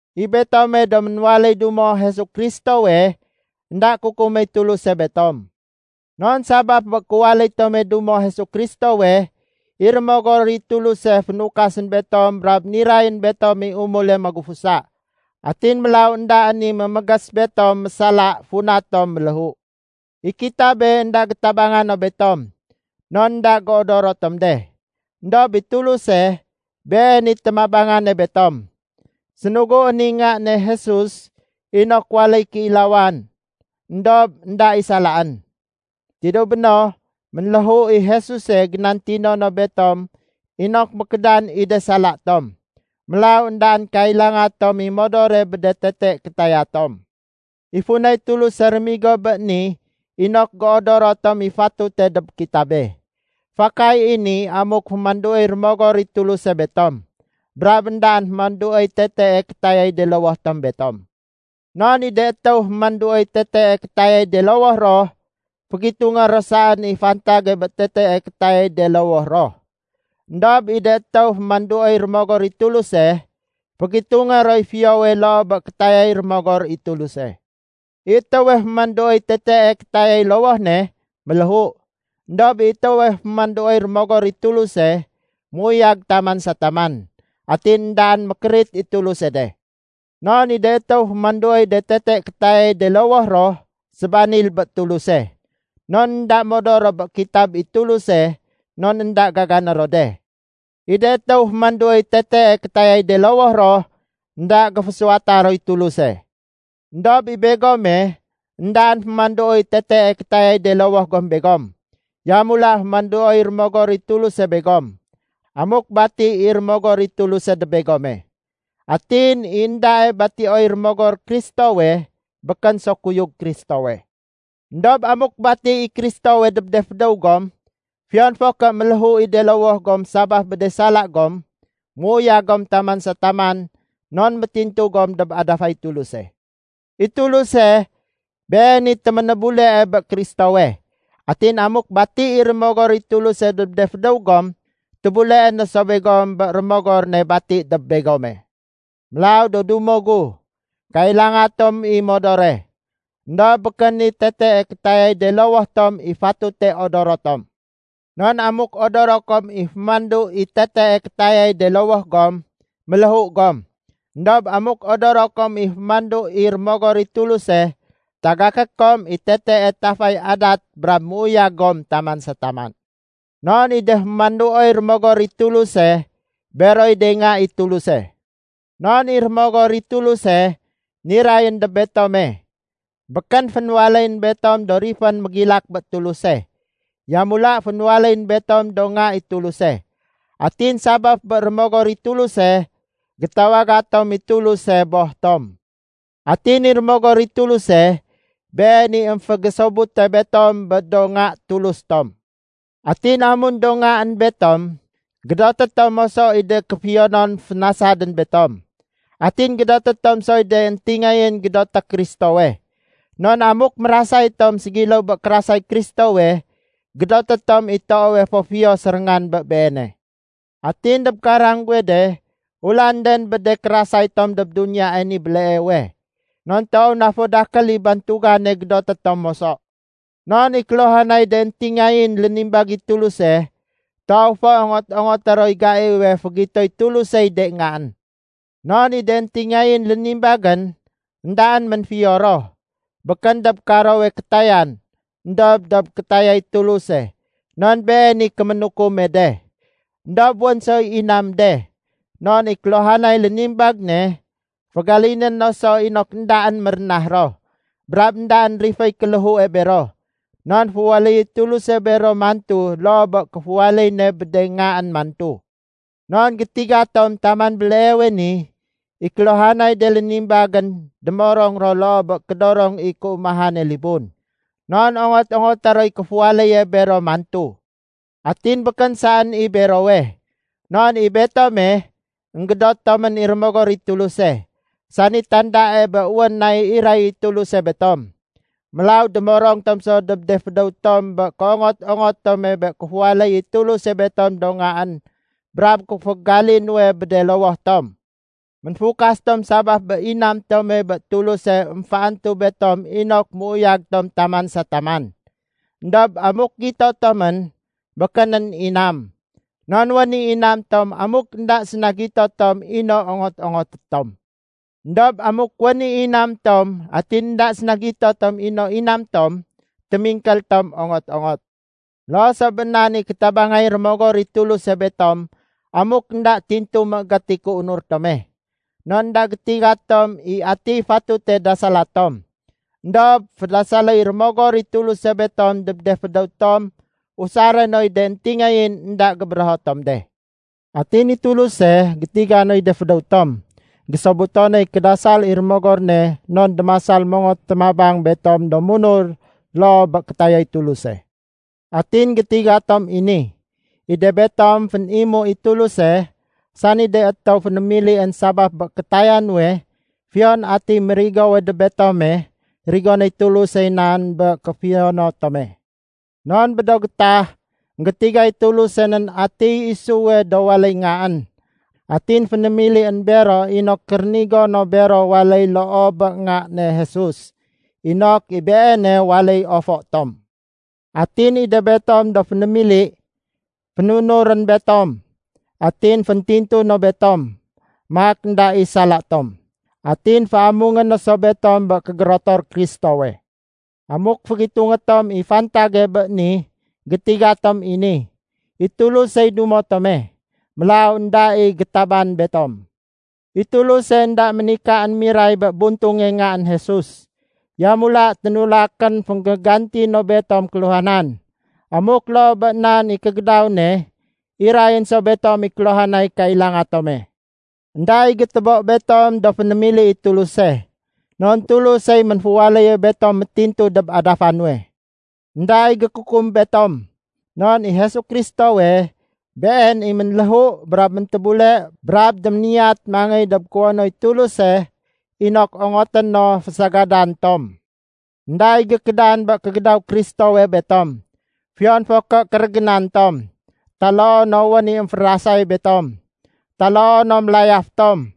I betome do ménwaléy dumo Jesu Kristowe, énda kukuméy Tuluse betom. Non sabaf bé kéwaléy tome dumo Jesu Kristowe, i Rémogor i Tuluse fénukasén betom brab nirayén betom i umule magufusa. Atin mélaw éndaén i mémégés betom mésala funa tom méléhu. I kitabe énda gétabanga no betom, non énda géodoro tom de. Endob i Tuluse, Been i témabangane betom. Sénuguén i Nga ne Jesus inok waléy kéilawan éndob énda i salaén. Tidéw béno, ménléhu i Jesuse génantino no betom inok mékédan i de sala tom. Mélaw éndaén kailanga tom i modore bé de tete kétaya tom. I funay Tuluse réménigo bé ni inok géodoro tom i fatute dob kitabe. Fakay i ni amuk fémanduoy Rémogor i Tuluse betom, brab éndaén fémanduoy tetee kétayay de lowoh tom betom. Non i de étéw fémanduoy tetee kétayay de lowoh ro, fégitungé ro saén i fantage bé tetee kétayay de lowoh ro. Endob i de étéw fémanduoy Rémogor i Tuluse, fégitungé roy fiyowe loo bé kétayay Rémogor i Tuluse. I étéwe fémanduoy tetee kétayay lowoh ne, méléhu. Endob i étéwe fémanduoy Rémogor i Tuluse, méuyag taman sa taman, atin éndaén mékérit i Tuluse de. Non i de étéw fémanduoy de tete kétayay de lowoh ro, sébanil bé Tuluse. Non énda modor ro bé kitab i Tuluse non énda gagané ro de. I de étéw fémanduoy tetee kétayay de lowoh ro, énda géfésuwata roy Tuluse. Endob i begome, éndaén fémanduoy tetee kétayay de lowoh gom begom. Yamula fémanduoy Rémogor i Tuluse begom, amuk bati i Rémogor i Tuluse dob begome. Atin i éndae batioy Rémogor Kristowe, békén so kuyug Kristowe. Endob amuk bati i Kristowe dob de fédéw gom, fiyon fo ké méléhu i de lowoh gom sabaf bé de sala gom, méuyag gom taman sa taman non métintu gom dob adafay Tuluse. I Tuluse, Been i téménébulee bé Kristowe. Atin amuk bati i Rémogor i Tuluse dob de fédéw gom, tébuleé no so begom bé Rémogor ne bati dob begome. Mélaw do dumo gu, kailanga tom i modore, éndob békén i tetee kétayay de lowoh tom i fatute odoro tom. Non amuk odoro kom i fémandu i tetee kétayay de lowoh gom, méléhu gom. Endob amuk odoro kom i fémandu i Rémogor i Tuluse, tagaké kom i tetee tafay adat brab méuyag gom taman sa taman. Non i de fémanduoy Rémogor i Tuluse, beroy de nga i Tuluse. Non i Rémogor i Tuluse nirayén dob betome, békén fénwaléyén betom do rifén mégilak bé Tuluse. Yamula fénwaléyén betom do nga i Tuluse. Atin sabaf bé Rémogor i Tuluse, gétawaga tom i Tuluse “Boh tom.” Atin i Rémogor i Tuluse, Been i émfégésobute betom bé do nga Tulus tom. Atin amun do ngaén betom, gédoté tom moso i de kéfiyonon fénasadén betom. Atin gédoté tom soy de éntingayén gédoté Kristowe. Non amuk mérasay tom ségiléw bé kérasay Kristowe, gédoté tom i toowe fo fiyo séréngan bé Beene. Atin dob karang guwe de, ulanden bé de kérasay tom dob duniyae ni béleewe. Non toow na fo dakél i bantugane gédoté tom moso. Non i kéluhanay de éntingayén lénimbag i Tuluse, toow fo ongot-ongoté roy gaiwe fégitoy Tulusey de ngaén. Non i de éntingayén lénimbagén, éndaén ménfiyo ro, békén dob karowe kétayan éndob dob kétayay Tuluse non Been i kéménukume de. Endob wén soy inam de, non i kéluhanay lénimbag ne, fégaliné no so inok éndaén mérénah ro, brab éndaén riféy kéléhue bero, non féwaléyéy Tuluse bero mantu loo bé kéféwaléy ne bé de ngaén mantu. Non gétiga tom taman béleewe ni, i kéluhanay de lénimbagén démorong ro loo bé kédorong i kéumahane libun. Non ongot-ongoté roy kéfuwaléye bero mantu. Atin békén saén i berowe. Non i betome, énggédot tomén i Rémogor i Tuluse, sani tandae bé wén nay iray i Tuluse betom. Mélaw démorong tom so dob de fédéw tom bé kéongot-ongot tome bé kéfuwaléy i Tuluse betom do ngaén brab kéfégali nuwe bé de lowoh tom. Ménfukas tom sabaf bé inam tome bé Tuluse émféantu betom inok méuyag tom taman sa taman. Endob amuk gito tomén, békénén inam. Non wén i inam tom amuk énda séna gito tom i no ongot-ongoté tom. Endob amuk wén i inam tom atin énda séna gito tom i no inam tom, témingkél tom ongot-ongot. Loo so bé nan i kétabangay Rémogor i Tuluse betom amuk énda tintu méégét i kéunur tome. Non énda gétiga tom i atiy fatute dasala tom. Endob fédasaléy Rémogor i Tuluse betom dob de fédéw tom usaré noy de éntingayén énda gébérého tom de. Atin i Tuluse, sani gétiga noy de fédéw tom, gésobuto noy kédasal i Rémogor ne non démasal mongot témabang betom do munur loo bé kétayay Tuluse. Atin gétiga tom i ni. I de betom fénimu i Tuluse, sani de étéw fénémilién sabaf bé kétaya nuwe, fiyon atiy mérigowe dob betome, rigonéy Tulusey nan bé kéfiyono tome. Non bé do gétah, énggétigay Tuluse nén atiy isuwe do waléy ngaén. Atin fénémilién bero inok rénigo no bero waléy loo bé Nga ne Jesus, inok i Beene waléy ofo tom. Atin i de betom do fénémili, fénunurén betom, atin féntintu no betom, maak énda i sala tom. Atin féamungé no so betom bé kégérotor Kristowe. Amuk fégitungé tom i fantage bé ni, gétiga tom i ni: I Tulusey dumo tome. Mélaw énda i gétaban betom. I Tuluse énda ménikaén miray bé buntunge Ngaén Jesus. Yamula ténulakén fénggéganti no betom kéluhanan. Amuk loo bé nan i kégédaw ne, irayén so betom i kéluhanay kailanga tome. Enda i gétébo betom do fénémili i Tuluse. Non Tulusey ménféwaléye betom métintu dob adafa nuwe. Enda i gékukum betom. Non i Jesu Kristowe, Been i ménléhu brab méntébule brab déméniyat mangéy dob kuwonoy Tuluse inok ongoté no fésagadan tom. Enda i gékédan bé kégédaw Kristowe betom. Fiyon fo ké kérégénan tom, taloo no wén i émférasay betom, taloo no mélayaf tom,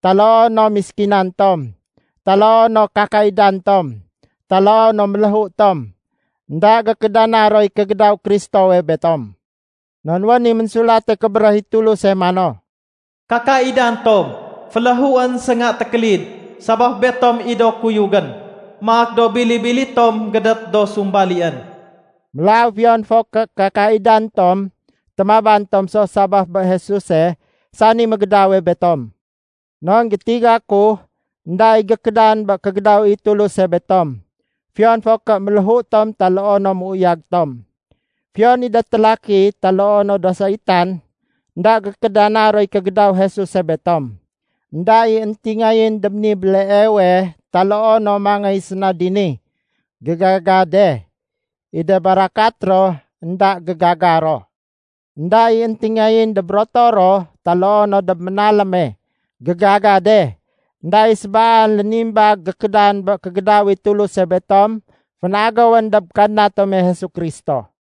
taloo no méskinan tom, taloo no kakaidan tom, taloo no méléhu tom, énda gékédana roy kégédaw Kristowe betom. Non wén i Ménsulate Kébéréh i Tuluse mano, “Kakaidan tom féléhuén sénga tékélid sabaf betom i do kuyugén. Maak do bili-bili tom gédét do sumbalién.” Mélaw fiyon fo ké kakaidan tom, témaban tom so sabaf bé Jesuse sani mégédawe betom. Non gétiga ku énda i gékédan bé kégédaw i Tuluse betom, fiyon fo ké méléhu tom taloo no méuyag tom. Fiyon i de télaki taloo no do saitan, énda gékédana roy kégédaw Jesuse betom. Enda i éntingayén dob ni béleewe taloo no mangéy séna dini, gégaga de. I de barakat ro énda gégaga ro. Enda i éntingayén dob rotoro, taloo no dob ménaléme, gégaga de. Enda i sébaan lénimbag gékédan bé kégédaw i Tuluse betom fénagéwén dob Kadna tome Jesu Kristo.